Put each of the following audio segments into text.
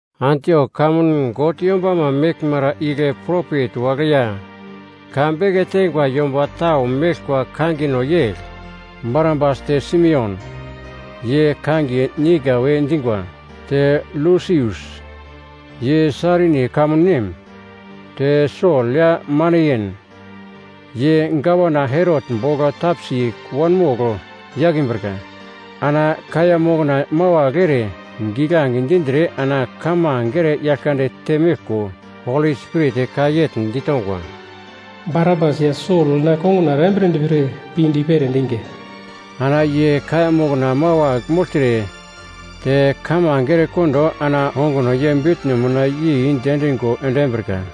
Antiok kamun God yombama meglmara igle propet wagle ya ka beke teingwa yomba tau meglkwa kangino yegl: Barnabas te Simeon, ye kangiye Niger we dingwa te Lusius, ye Sairini kamun nem, te Sol ya Maneyen, ye Gavana Herot bogl tapsi wanmogl yakimbrika. Ana kaiya mokna mawagl ere giglange dindre ana kamange ere Yaglkande temeglko, Holi Spirit ka yegl ditongwa, “Barnabas ya Sol na konguna erambiredi pre pinde i-pere endinga.” Ana ye kaiya mokna mawagl mogltre te kamange erekondo ana onguno ye bitno mina yei diendingo endimbrika.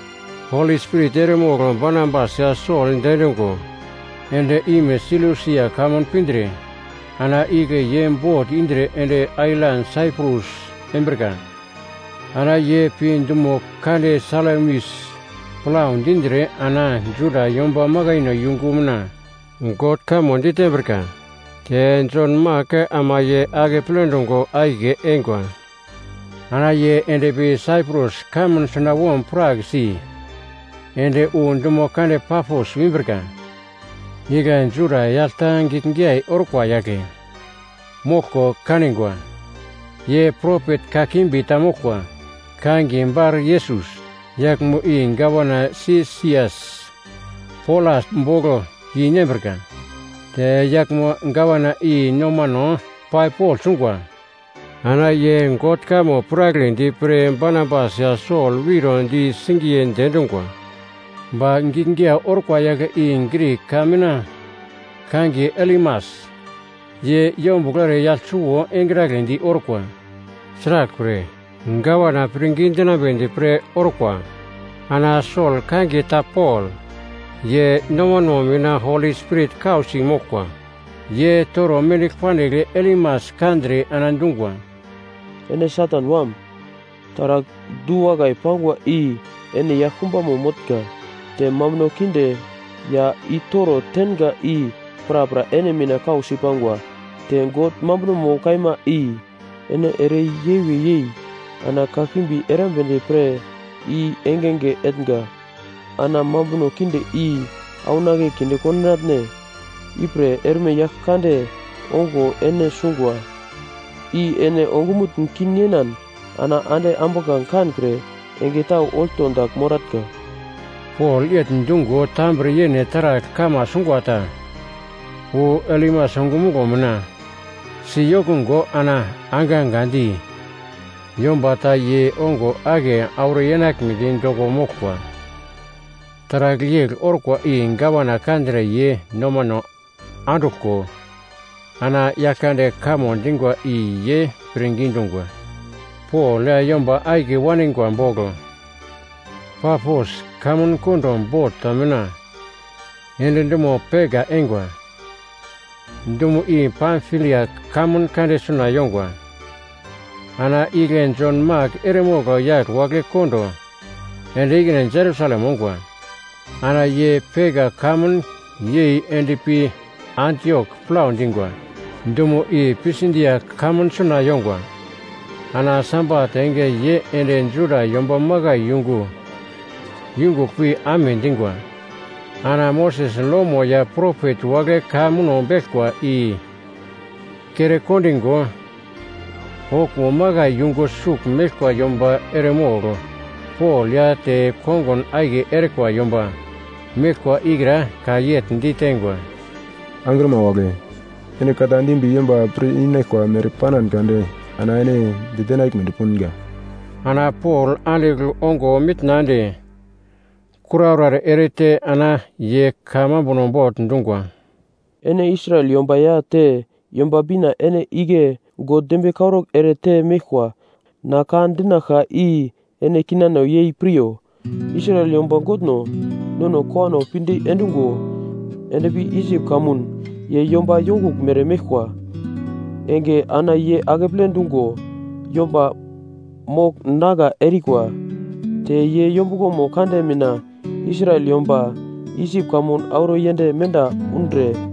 Holi Spirit eremogl Barnabas ya Sol diendungo end-ime Selusia kamun pindre ana igle ye bot indre ende ailan Saiprus embrika. Ana ye pi dumo kande Salamis plau dindre ana Juda yomba makaino yungu mina God kamo ditembrika. Te Jon Mak ama ye akeple dungo akiye eingwa. Ana ye endpi Saiprus kamun sunawom prak si ende wu dumo kande Pafos wimbrika, igle Juda yagl ta giglgiyai orkwa yagle moglko kaningwa. Ye propet kakimbi ta moglkwa, kangiye Baryesus. Yaglmo i gavana Sesias Polas bogl yeinembrika. Te yaglmo gavana i nomano pai pogl sungwa, ana ye God kamo piragledi pre Barnabas ya Sol wiro di singiye diendungwa, ba giglgiyai orkwa yagle i Grik ka mina kangiye Elimas, ye yombuglo ere yagl suwo engragledi orkwa. Sraglpre, gavana pirngidi dinambedi pre orkwa. Ana Sol kangiye ta Pol, ye nomano mina Holi Spirit kausi moglkwa, ye toro mendigl pandigl Elimas kandre ana dungwa, “Ene Satan wam! Taragl du-wakai pangwa i ene yaglkumbamo motnga te mambuno kinde ya i-toro tenga i prapra ene mina kausi pangwa, te God mambunomo kaima i ene ere yewe yei ana kakimbi erambedi pre i engenge etnga, ana mambuno kinde i aunake kinde kondinatne? Ipre erme Yaglkande ongo ene sungwa, i ene ongumutn kin yenan ana ande ambuglange kankre enge tau olto dagl moratnga.” Pol yegl dungo tambre yene taragl kama sungwa ta wu Elimas ongumuglo mina si yokungo ana angangandi yomba ta ye ongo ake auro yenaglmedi doko moglkwa. Taragl yegl orkwa i gavana kandre ye nomano anduglko ana Yaglkande kamo dingwa i ye pirngi dungwa. Pol ya yomba akiye waningwa bogl Pafos kamun kondo bot ta mina ende dumo Perga eingwa; dumo i Pamfilia kamun kande suna yongwa. Ana igle Jon Mak eremogl yagl wagle kondo ende ikine Jerusalem ongwa. Ana ye Perga kamun yei endpi Antiok plau dingwa, dumo i Pisidia kamun suna yongwa. Ana Sabat enge ye ende Juda yomba makai yungu yungugl pi amedingwa. Ana Moses lomo ya propet wagle ka muno beglkwa i kere kondingo, okuwo makai yungu sugl meglkwa yomba eremogl Pol ya te kongun akiye erikwa yomba meglkwa ikra ka yegl diteingwa, “Angrima wagle, ene ka ta dimbi yomba pir-inaglkwa mere panan kade ana ene ditenaglmedi punga.” Ana Pol andigl ongo mitna ende kuraura erete ana ye ka mambuno bogl dungwa, “Ene Israel yomba ya te Yomba Bina ene igle God dembiye karaugl ere te meglkwa na ka dinaglka i ene kinano yei piryo, Israel yomba Godno, nono kowano pinde endungo endpi Isip kamun ye yomba yonguglmere meglkwa enge ana ye akeple dungo yomba mogl nagla erikwa. Te ye yombuglomo kande mina Israel yomba Isip kamun auro yend menda undre,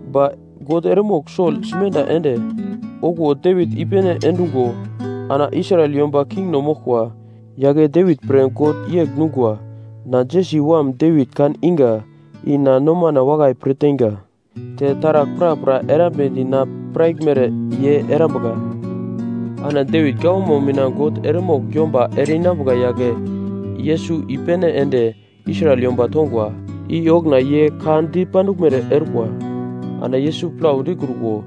Ba God eremogl Sol simenda ende okuwo Devit i-pene endungo ana Israel yomba kingno moglkwa. Yagle Devit pre God yegl dungwa, ‘Na, Jesi wam Devit kan inga i na nomana wakai pir teinga, te taragl prapra erambedi na piraglmere ye erambuka.’ “Ana Devit gawamo mina God eremogl yomba ere-inambuka yagle Yesus i-pene ende Israel yomba tongwa, i okuna ye ka dipanduglmere orkwa. Ana Yesus plau dikruko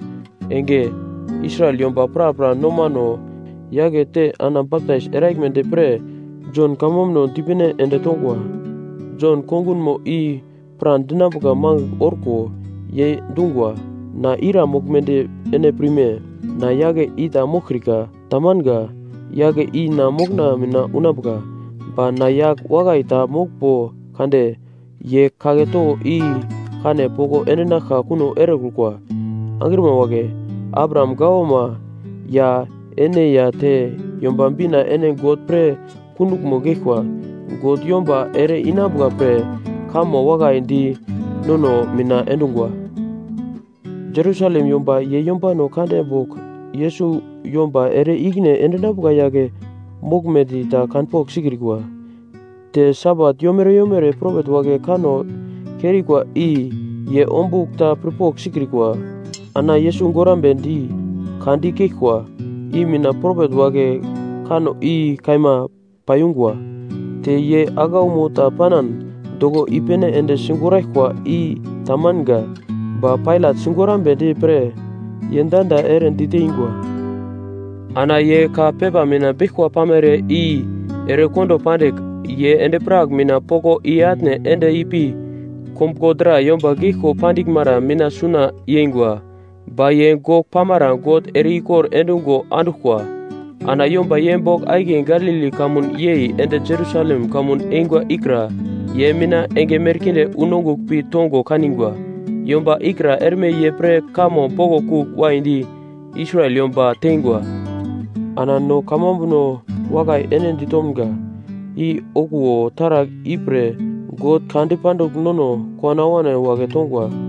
enge Israel yomba prapra nomano yakete ana baptais eraglmedi pre Jon kamambuno dipene ende tongwa. Jon kongunmo i pradinambuka mangigl orko ye dungwa, ‘Na ira moglmedi ene pirme? Na, yagle i ta moglkrika. Tamanga. Yagle i na mokona mina unambuka, ba na yagl wakai ta moglmbo kade ye kagle towo i kane poko endinaglka kuno erekrukwa.’ “Angrima wagle, Abraham gawama ya ene ya te Yomba Bina ene God pre kunduglmo geglkwa. God yomba ere-inambuka pre kamo wakai di nono mina endungwa. Jerusalem yomba ye yombano kande bogl Yesus yomba ere-ikine endinambuka yagle moglmedi ta kanpogl sikrikwa. Te Sabat yomere yomere propet wagle kanno kerikwa i ye ombugl ta pirpogl sikrikwa. Ana Yesus gorambedi ka dikeglkwa i mina propet wagle kanno i kaima paiyungwa. Te ye aglaumo ta panan doko i-pene ende sigoraglkwa i ta manga, ba Pailat sigorambedi pre ye danda ere diteingwa. Ana ye ka pepa mina beglkwa pamere i erekondo pandigl, ye endi-prak mina poko i-atne ende ipi kombuglo dra yomba geglko pandiglmara mina suna yengwa. Ba ye gogl pamara God ere-ikor endungo anduglkwa. Ana yomba ye bogl akiye Galili kamun yei ende Jerusalem kamun eingwa ikra ye mina enge merkinde wu nongugl pi tongo kanigwa. Yomba ikra erme ye pre kamo boglo kugl waidi Israel yomba teingwa. “Ana no kamambuno wakai ene ditomga, i okuwo taragl ipre God ka dipandigl nono kowano awano wagle tongwa.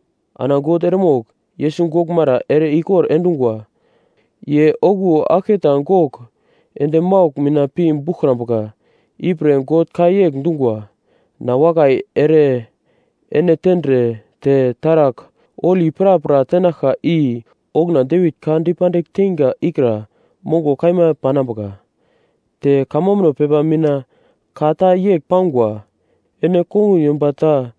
Ana God eremogl Yesus goglmara ere-ikor endungwa. Ye okuwo aglketa gogl ende maugl mina pi buglkrambuka ipre God ka yegl dungwa: “‘Na wakai ere ene tendre te taragl holi prapra tenaglka i okuna Devit ka dipandigl teinga ikra mongo kaima panambuka.’ Te kamambuno pepa mina ka ta yegl pangwa, “‘Ene kongun yomba ta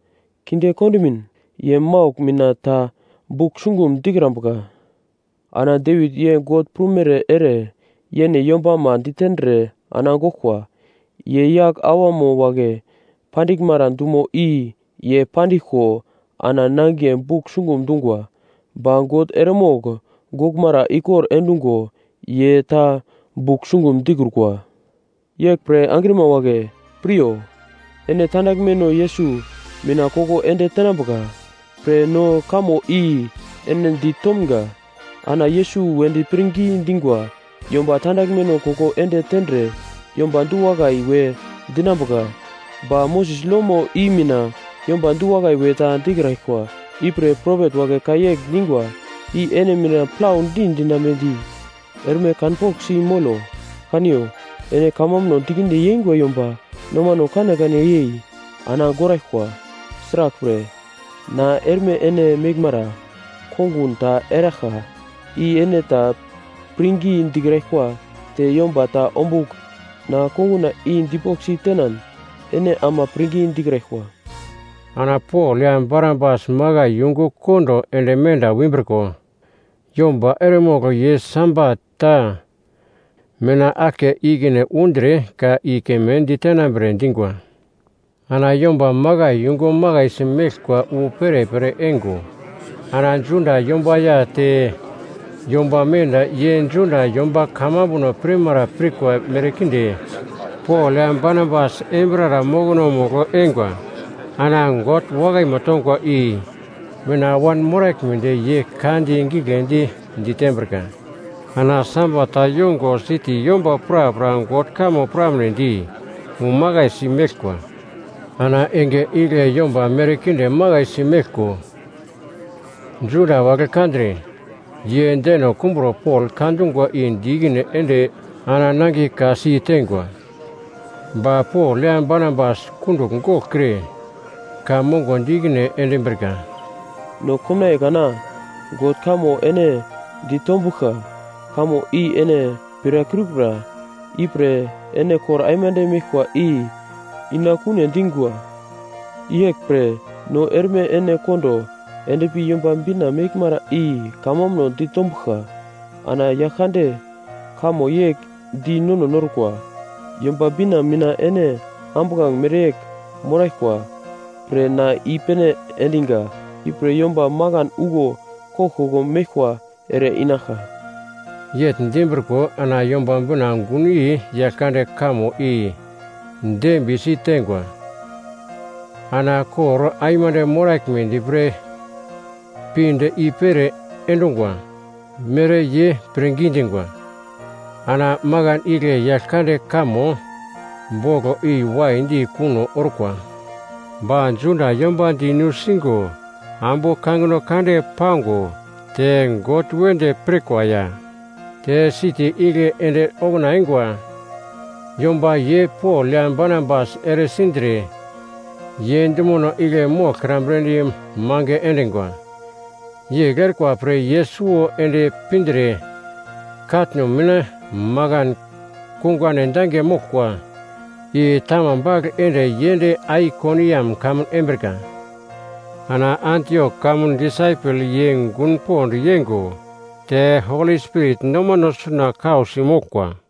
kinde kondimin ye maugl mina ta bugl sungum dikrambuka.’ “Ana Devit ye God prumere ere yene yombama ditendre ana goglkwa. Ye yagl awama wagle pandiglmara dumo i ye pandiglko ana nangiye bugl sungum dungwa. Ba God eremogl goglmara ikor endungo ye ta bugl sungum dikrukwa. “Yeglpre angrima wagle, piryo. Ene tandaglmeno Yesus mina koko ende tenambuka pre no kamo i ene di tomga. Ana Yesus wedi pirngi dingwa yomba tandaglmeno koko ende tendre yomba du-wakai we dinambuka ba Moses lomo i mina yomba du-wakai we ta dikraglkwa. Ipre propet wagle ka yegl dingwa i ene mina plaudi dinambedi erme kanpoglsi molo: “‘Kaniyo, ene kamambuno dikinde yengwa yomba nomano kanekane yei ana goraglkwa. Sraglpre, na erme ene meglmara kongun ta eraglka, i ene ta pirngi dikraglkwa te yomba ta ombugl na konguna i dipoglsi tenan ene ama pirngi dikraglkwa.’” Ana Pol ya Barnabas makai yungu kondo ende menda wimbriko yomba eremogl ye Sabat ta mina aglke ikine undre ka i keme ditenambre dingwa. Ana yomba makai yungu makaisi meglkwa wu perepere eingo, ana Juda yomba ya te yomba menda ye Juda yomba kamambuno pirmara pirkwa merkinde Pol ya Barnabas embirara mokonomugl eingwa. Ana God wakaimo tongwa i mina wanmoraglmedi ye ka giglendi ditembrika. Ana Sabat ta yongo siti yomba prapra God kamo piramnedi umakaisi meglkwa. Ana enge igle yomba merkinde makaisi meglko Juda wagle kandre, ye deno kumbro Pol ka dungwa i di ikine ende ana nangiye ka-si teingwa. Ba Pol ya Barnabas kundugl goglkre ka mongo di ikine endimbrika, “No komnaiye kana God kamo ene ditombuglka, kamo i ene pirakrikura ipre ene kor aimande meglkwa i inakune dingwa. Yeglpre no erme ene kondo endpi Yomba Bina meglmara i kamambuno ditombuglka. Ana Yaglkande kamo yegl di nono norkwa: “‘Yomba Bina mina ene ambuglange mereyegl moraglkwa pre na i-pene endiga, ipre yomba makan uglo koglkoglo meglkwa ere-inaglka.’” Yegl dimbriko ana Yomba Bina gunyei Yaglkande kamo i dembiye siteingwa. Ana kor aimande moraglmedi pre pinde i-pere endungwa mere ye pirngi dingwa. Ana makan igle Yaglkande kamo boglo i waidi kuno orkwa. Ba Juda yomba di nusingo ambu kangino kande pango, te God wedi pirkwa ya te siti igle ende okuna eingwa yomba ye Pol ya Barnabas eresindre ye dumono igle moglkrambredi mange endingwa. Yegl erikwa pre ye suwo ende pindre katno mina makan kungane dange moglkwa i tama bagl ende ye ende Aikoniam kamun embrika. Ana Antiok kamun disaipel ye gun pond yeingo te Holi Spirit nomano suna kausi moglkwa.